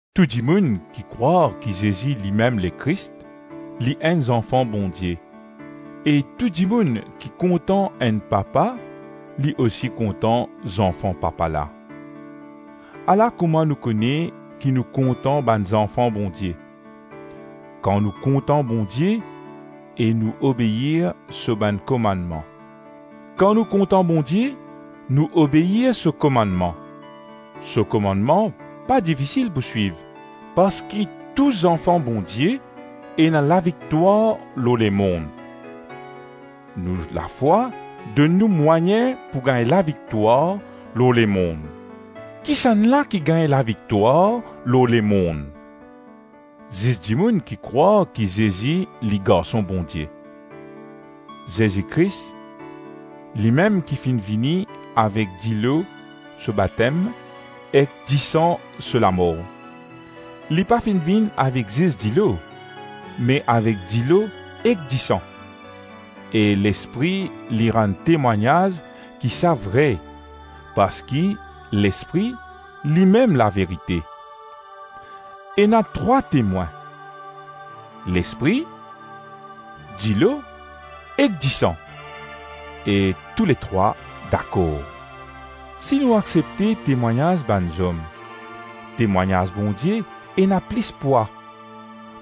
Tou dimoun ki krwar ki Zezi limem Lekris, li enn zanfan Bondie; e tou dimoun ki kontan enn papa li osi kontan zanfan papa la. Ala kouma nou kone ki nou kontan bann zanfan Bondie: kan nou kontan Bondie e nou obeir so bann komannman. Kan nou kontan Bondie, nou obeir so komannman. So komannman pa difisil pou swiv, parski tou zanfan Bondie ena laviktwar lor lemonn. Nou lafwa donn nou mwayin pou gagn laviktwar lor lemonn. Kisannla ki gagn laviktwar lor lemonn? Zis dimoun ki krwar ki Zezi li Garson Bondie. Zezi Kris, limem ki finn vini avek dilo so batem ek disan so lamor. Li pa finn vinn avek zis dilo, me avek dilo ek disan; e Lespri li rann temwagnaz ki sa vre, parski Lespri limem laverite. Ena trwa temwin: Lespri, dilo ek disan, e touletrwa dakor. Si nou aksepte temwagnaz bann zom, temwagnaz Bondie ena plis pwa;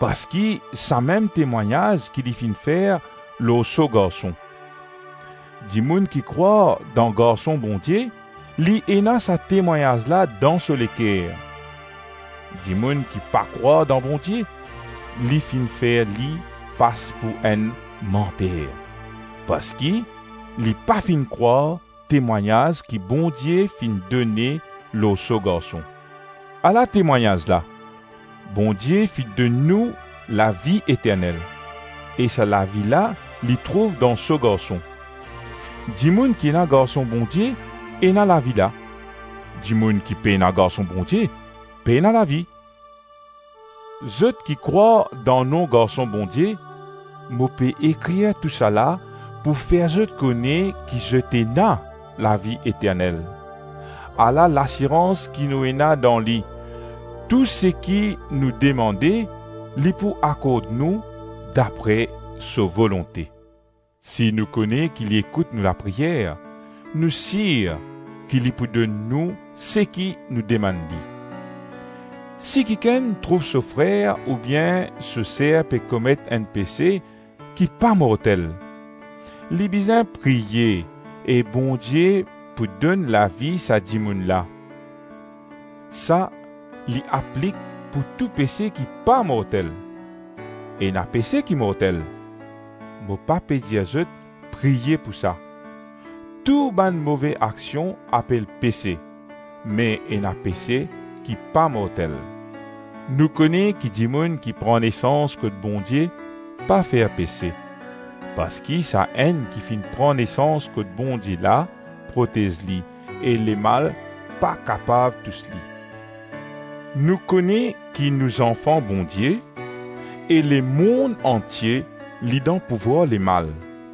parski samem temwagnaz ki li finn fer lor so Garson. Dimoun ki krwar dan Garson Bondie, li ena sa temwagnaz la dan so leker. Dimoun ki pa krwar dan Bondie, li finn fer li pas pou enn manter, parski li pa finn krwar temwagnaz ki Bondie finn done lor so Garson. Ala temwagnaz la: Bondie finn donn nou lavi eternel, e sa lavi la li trouv dan so Garson. Dimoun ki ena Garson Bondie ena lavi la; dimoun ki pena Garson Bondie, pena lavi. Zot ki krwar dan nom Garson Bondie, mo pe ekrir tousala pou fer zot kone ki zot ena lavi eternel. Ala lasirans ki nou ena dan li: tou seki nou demande, li pou akord nou dapre so volonte. Si nou kone ki li ekout nou lapriyer, nou sir ki li pou donn nou seki nou demann li. Si kikenn trouv so frer oubien so ser pe komet enn pese ki pa mortel, li bizin priye e Bondie pou donn lavi sa dimoun la. Sa li aplik pou tou pese ki pa mortel. Ena pese ki mortel; mo pa pe dir zot priye pou sa. Tou bann move aksion apel pese, me ena pese ki pa mortel. Nou kone ki dimoun ki pran nesans kot Bondie, pa fer pese, parski Sa-Enn ki finn pran nesans kot Bondie la protez li, e Lemal pa kapav tous li. Nou kone ki nou zanfan Bondie, e lemonn antie li dan pouvwar Lemal.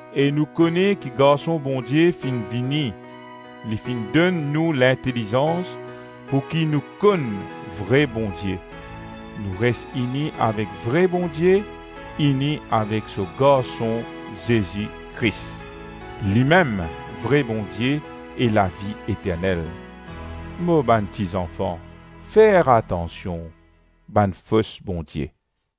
E nou kone ki Garson Bondie finn vini, li finn donn nou lintelizans pouki nou konn vre Bondie. Nou res ini avek vre Bondie, ini avek so Garson Zezi Kris. Limem vre Bondie e lavi eternel. Mo bann ti zanfan, fer atansion bann fos bondie.